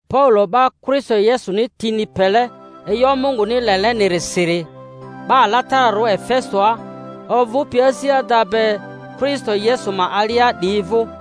Paulo 'ba Kristo Yesuni tini pele e'yo Munguni lelenirisiri, 'Ba alatararᴜ Efesoa ovᴜpi asi ada be Kristo Yesu ma alia 'diyi vᴜ: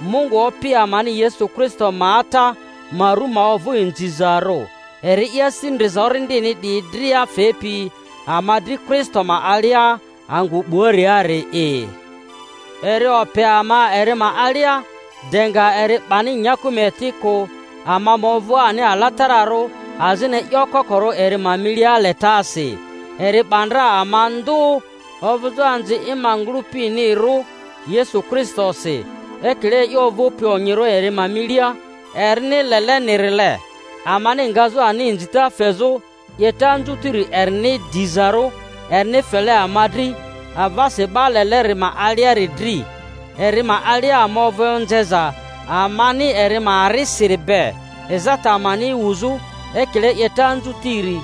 Mungu Opi amani Yesu Kristo ma Ata ma ru ma ovᴜ inzizarᴜ, eri'i asi ndriza orindini 'diyi dria fepi ama dri Kristo ma alia angᴜ 'buariari'i; eri ope ama eri ma alia de nga eri 'bani nyaku ma eti kᴜ, ama ma ovᴜ ani alatararᴜ azini e'yo kokorᴜ eri ma milia letasi. Eri 'ba ndra ama ndᴜ ovᴜzᴜ anzi i ma ngᴜlᴜpinirᴜ Yesu Kristosi, ekile e'yo ovᴜpi onyirᴜ eri ma milia erini lelenirile, amani ngazᴜ ani inzita fezᴜ 'yeta anzutiri erini dizarᴜ, erini fele ama dri avasi 'Ba Leleri ma aliari dri. Eri ma alia ama ovᴜ onzeza amani eri ma arisiri be, ezata amani wuzᴜ, ekile 'yeta anzutiri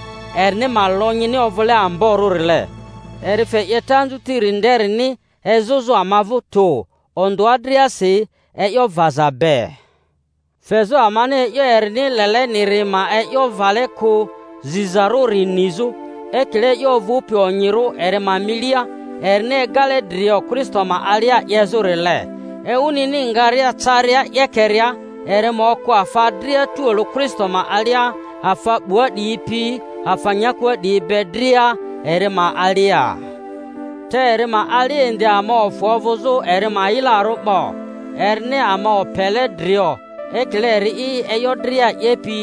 erini ma lonyini ovᴜle amborᴜrile; eri fe 'yeta anzutiri nderini ezᴜzᴜ ama vᴜ tᴜ, ondᴜa driasi e'yo vaza be, fezᴜ amani e'yo erini leleniri ma e'yo vale kᴜ zizarᴜri nizᴜ, ekile e'yo ovᴜpi onyirᴜ eri ma milia, erini egale drio Kristo ma alia 'yezᴜrile, ewunini nga-ria caria 'yekeria eri ma okᴜ afa dria tualᴜ Kristo ma alia, afa 'bua 'diyi pi afa nyakua 'diyi be dria eri ma alia. Te eri ma alia indi ama ofᴜ ovᴜzᴜ eri ma yilarᴜ 'bo, erini ama opele drio ekile eri'i e'yo dria 'yepi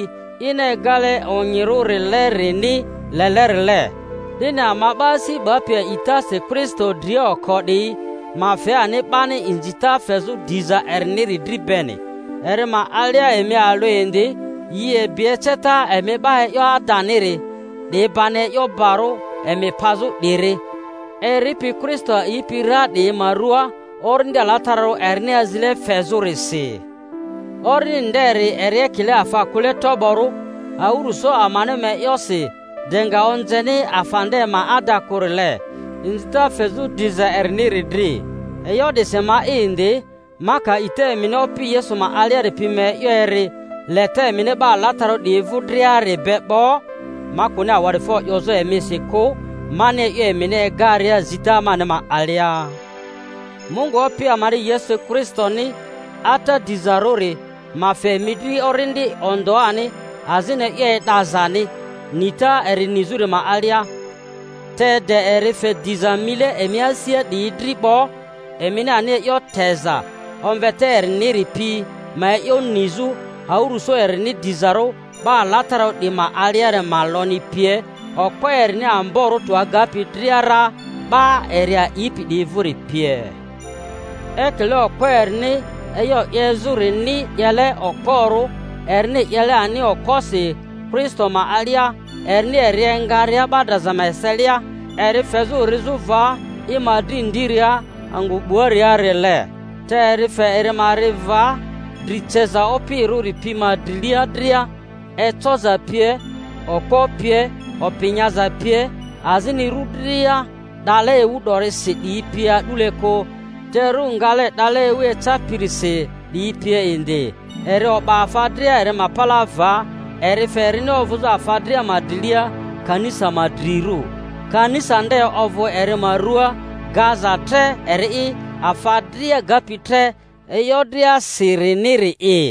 ini egale onyirᴜrilerini lelerile, 'dini ama 'ba asi 'bapi a'itasi Kristo dria oko 'diyi ma fe ani 'bani inzita fezᴜ diza eriniri dri beni. Eri ma alia, emi alᴜ indi, yi ebi eceta emi 'ba e'yo adaniri—'di bani e'yo barᴜ emi pazᴜ 'diri—eripi Kristo a'ipi ra 'diyi ma ruaa, Orindi Alatararᴜ erini azile fezᴜrisi. Orindi nderi eri ekile afa kᴜle toborᴜ awᴜrᴜso amani ma e'yosi de nga onzeni afa nde ma ada kᴜrile, inzita fezᴜ diza eriniri dri. E'yo 'disi ma'i indi, ma ka a'ita emini Opi Yesu ma aliari pi ma e'yo eri, leta emini 'ba alatararᴜ 'diyi vᴜ driari be 'bo, ma kᴜni awa'difo 'yozᴜ emisi kᴜ, mani e'yo emini egaria zita mani ma alia, Mungu Opi amani Yesu Kristoni, Ata diza-rᴜri, ma fe emi dri orindi ondᴜani azini e'yo e'dazani, nita eri nizᴜri ma alia, te de eri fe diza mile emi asia 'diyi dri 'bo, emini ani e'yo teza omveta eriniri pi ma e'yo nizᴜ, awᴜrᴜso erini dizarᴜ 'ba alatararᴜ 'diyi ma aliari ma lonyi pie, okpo erini amborᴜ tᴜ agapi dria ra 'ba eri a'ipi 'diyi vᴜri pie, ekile okpo erini e'yo 'yezᴜrini 'yele okporᴜ, erini 'yele ani okposi Kristo ma alia, erini eri engaria 'ba draza ma eselia, eri fezᴜ rizᴜ va i ma dri ndiria angᴜ 'buariarile. Te eri fe eri ma ri va dri ceza opirᴜri pi ma drilia dria, ecoza pie, okpo pie, opi nyaza pie, azini ru dria 'dale ewu 'dorisi 'diyi pie a'dule kᴜ, te ru ngale 'dale ewu ecapirisi 'diyi pie indi; eri o'ba afa dria eri ma palaa va, eri fe erini ovᴜzᴜ afa dria ma drilia kanisa ma drirᴜ; kanisa nde ovᴜ eri ma rua, gaza tre eri'i afa dria gapi tre e'yo driasiriniri'i.